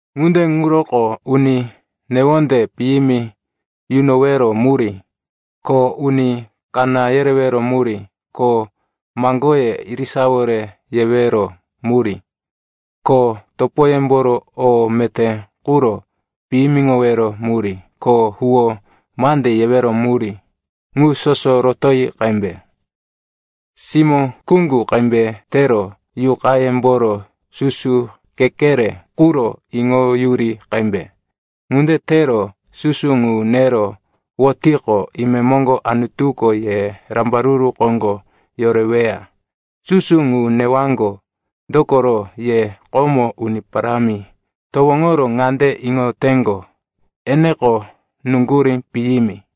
Ŋunde ŋuroko uni newonde piyimi yunowero murí, ko uni kaná yerewero murí, ko maŋgoye irisawore yewero murí, ko topoyemboro o meté quro piyimiŋowero murí, ko huwó mande yewero murí, ŋu soso rotoyi qembe. Simó kuŋgu qembe tero yuqayemboro susu kekere quro iŋoyuri qembe. Ŋunde tero susu ŋu nero wotiqo, imemoŋgo Anutuko ye rambaruru koŋgo yoreweya. Susu ŋu newaŋgo, dokoro ye komo Uni Parámi towoŋoro ŋande iŋoteŋgo, eneko nuŋgurí piyimi.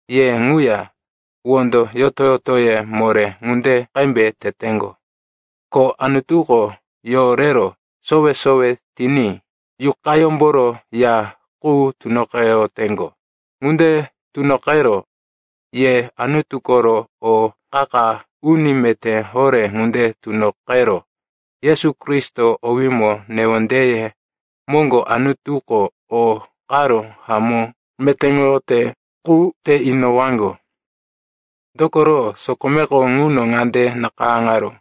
ye ŋuya wondo yoto-yotoye moré ŋunde qembe teteŋgo, ko Anutuko yorero sowe-sowe tiní Yuqayómboro ya qu tunoqeyoteŋgo. Ŋunde tunoqero ye Anutu koro o qa-qa uni meté horé ŋunde tunoqero Yesu Kristo owímo newondeye moŋgo Anutuko o karo hamó metéŋoyote qu te inowaŋgo. Dokoro sokomeko ŋuno ŋande nakayáŋaró,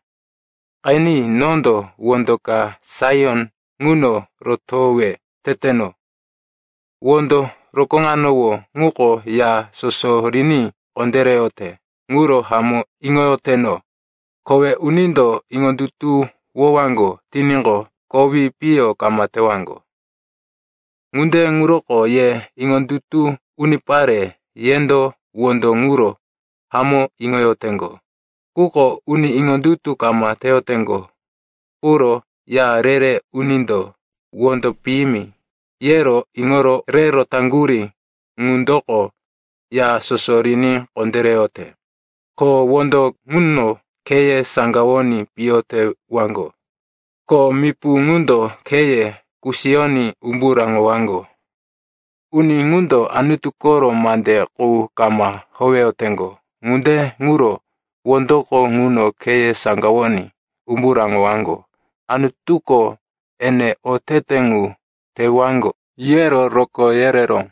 “Qeni, nondo wondo ka Saion ŋuno rotowe teteno, wondo rokóŋanowó ŋuko ya soso riní kondéreyote, ŋuro hamó iŋoyoteno. Kowe unindo iŋondutuwowaŋgo tiníqo, kowi piyo kama tewaŋgo.” Ŋunde ŋuroko ye iŋondutu unipare, yendo wondo ŋuro hamó iŋoyoteŋgo. Quko uni iŋondutu kama teyoteŋgo quro, “Ya re-re unindo, wondo piyimi, yero iŋoro re rotaŋgurí ŋundoko ya soso riní kondéreyote.” Ko, “Wondo ŋuno kheye saŋgawoní piyo tewaŋgo, ko mipu ŋundo kheye kusiyoní umbu raŋowaŋgo.” Uni ŋundo Anutu koro mande qu kama howeyoteŋgo, ŋunde ŋuro wondoko ŋuno kheye saŋgawoní umbu raŋowaŋgo. Anutuko, ene otete ŋu tewaŋgo, yero rokó yereró.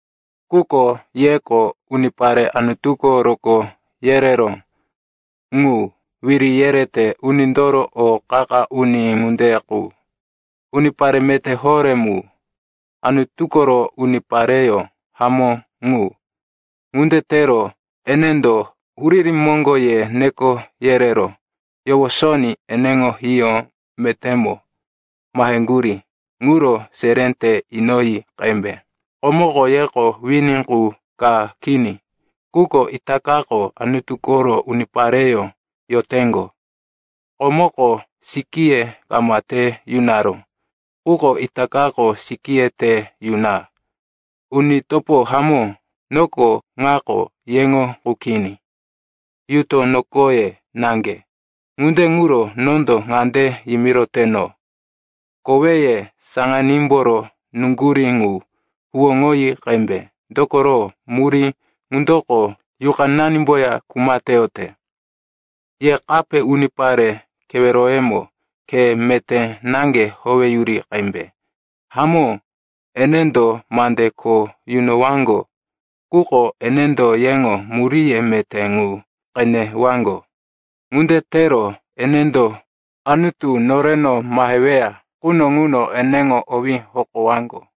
Quko yeko unipare Anutuko rokó yereró ŋu, wiri yerete unindoro o qa-qa uni ŋunde qu, unipare meté horé mu, Anutu koro unipareyó hamó ŋu. Ŋunde tero enendo huriri moŋgo ye neko yerero yowosoní eneŋo hiyó metémo maheŋgurí ŋuro seré te inoyi qembe. Komoko yeko wini qu ka kini, quko itakako Anutu koro unipareyó yoteŋgo. Komoko sikíye kama te yunaró, quko itakako sikíye te yuna. Uni topo hamó, noko ŋako yeŋo qu kini, yuto nokoye naŋge. Ŋunde ŋuro nondo ŋande yimiroteno, koweye saŋanímboro nuŋgurí ŋu huwóŋoyi qembe, dokoro murí ŋundoko yuqananimboya kuma teyote. Ye kape unipare keweroyemo khe meté naŋge howeyuri qembe. Hamó, enendo mande kho yunowaŋgo, quko enendo yeŋo muríye meté ŋu qenewaŋgo. Ŋunde tero enendo Anutu noreno maheweya quno ŋuno eneŋo owí hokowaŋgo.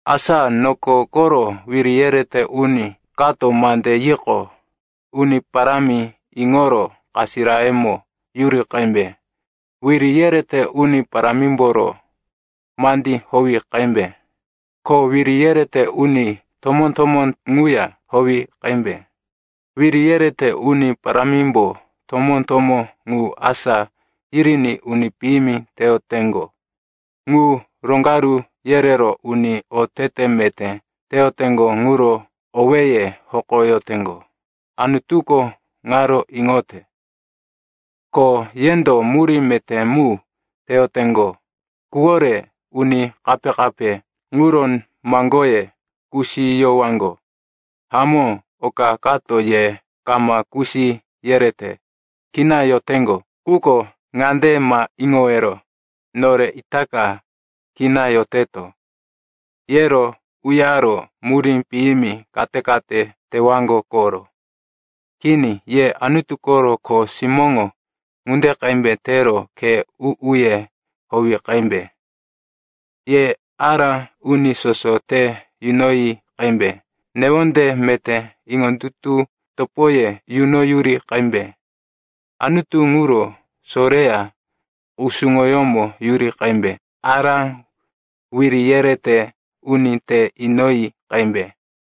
Asa noko koro wiri yerete uni kato mande yiqo, Uni Parámi iŋoro kasirayemo yuri qembe. Wiri yerete uni parámimboro mandí howi qembe, ko wiri yerete uni tomó-tomó ŋuya howi qembe. Wiri yerete uni parámimbo tomó-tomó ŋu asá yiriní uni piyimi teyoteŋgo ŋu roŋgaru yerero uni otete meté teyoteŋgo ŋuro owéye hokoyoteŋgo. Anutuko ŋaro iŋote, ko yendo murí meté mu teyoteŋgo quwore uni kape-kape ŋuro maŋgoye kusiyowaŋgo. Hamó, oka kato ye kama kusi yerete, kina yoteŋgo. Quko ŋande ma iŋowero, “Nore itaka kina yoteto,” yero uyaro murí piyimi kate-kate tewaŋgo koro. Kini, ye Anutu koro kho simóŋo ŋunde qembe tero khe u-uye howi qembe. Ye ará uni soso te yunoyi qembe, newonde meté iŋondutu topoye yunoyuri qembe, Anutu ŋuro soreya kusuŋoyómo yuri qembe, ará wiri yerete uni te inoyi qembe.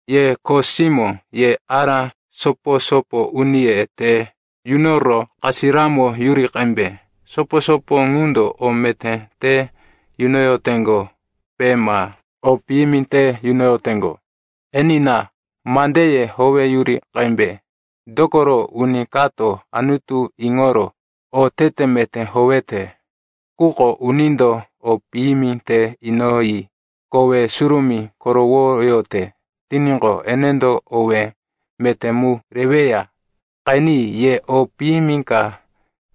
Ye kho simó, ye ará sopo-sopo uniye te yunoro kasiramo yuri qembe. Sopo-sopo ŋundo o meté te yunoyoteŋgope ma o piyimi te yunoyoteŋgo, enina, mandeye howeyuri qembe. Dokoro uni kato Anutu iŋoro otete meté howete, quko unindo o piyimi te inoyi kowe surumí korowoyote tiníqo, enendo owé meté mu reweya. Qeni, ye o piyimi ka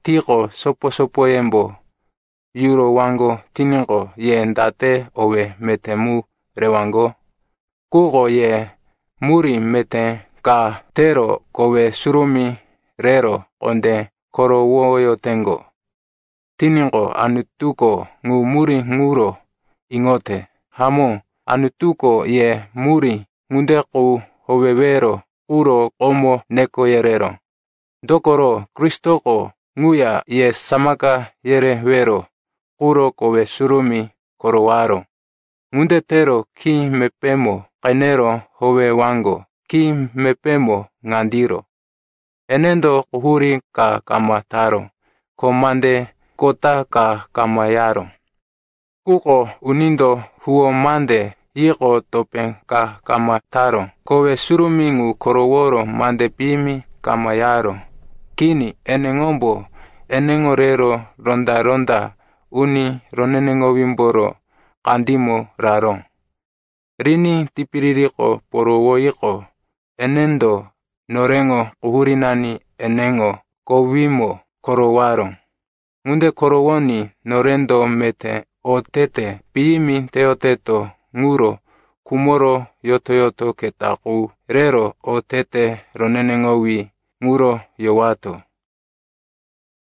tiqo sopo-sopoyembo yurowaŋgo tiníqo, ye date owé meté mu rewaŋgo? Quko ye murí meté ka tero kowe surumí rero kondé korowoyoteŋgo tiníqo, Anutuko ŋu murí ŋuro iŋote. Hamó, Anutuko ye murí ŋunde qu howewero quro komo neko yereró, dokoro Kristoko ŋuya ye samaka yerewero quro kowe surumí korowaró. Ŋunde tero khí mepémo qenero howewaŋgo. Khí mepémo ŋandiro, “Enendo quhurí ka kama taró, ko mande kota ka kama yaró.” Quko unindo huwó mande yiqo topé ka kama taró; kowe surumí ŋu koroworo mande piyimi kama yaró. Kini, eneŋombo eneŋo rero ronda-ronda uni roneneŋowímboro kandímo raró. Riní tipiririko porowoyiqo, enendo noreŋo quhurínani eneŋo kowímo korowaró. Ŋunde korowoní norendo meté otete piyimi teyoteto ŋuro khumoro yoto-yoto keta qu rero otete roneneŋowí ŋuro yowato.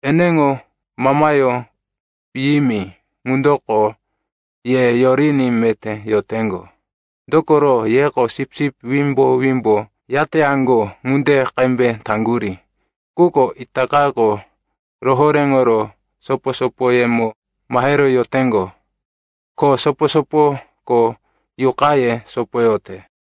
Eneŋo mamayó piyimi ŋundoko ye yoriní meté yoteŋgo. Dokoro yeko sipsip wimbo-wimbo yateyaŋgo ŋunde qembe taŋgurí. Quko itakako rohoréŋoro sopo-sopoyemo mahero yoteŋgo, ko sopo-sopoko yuqaye sopoyote.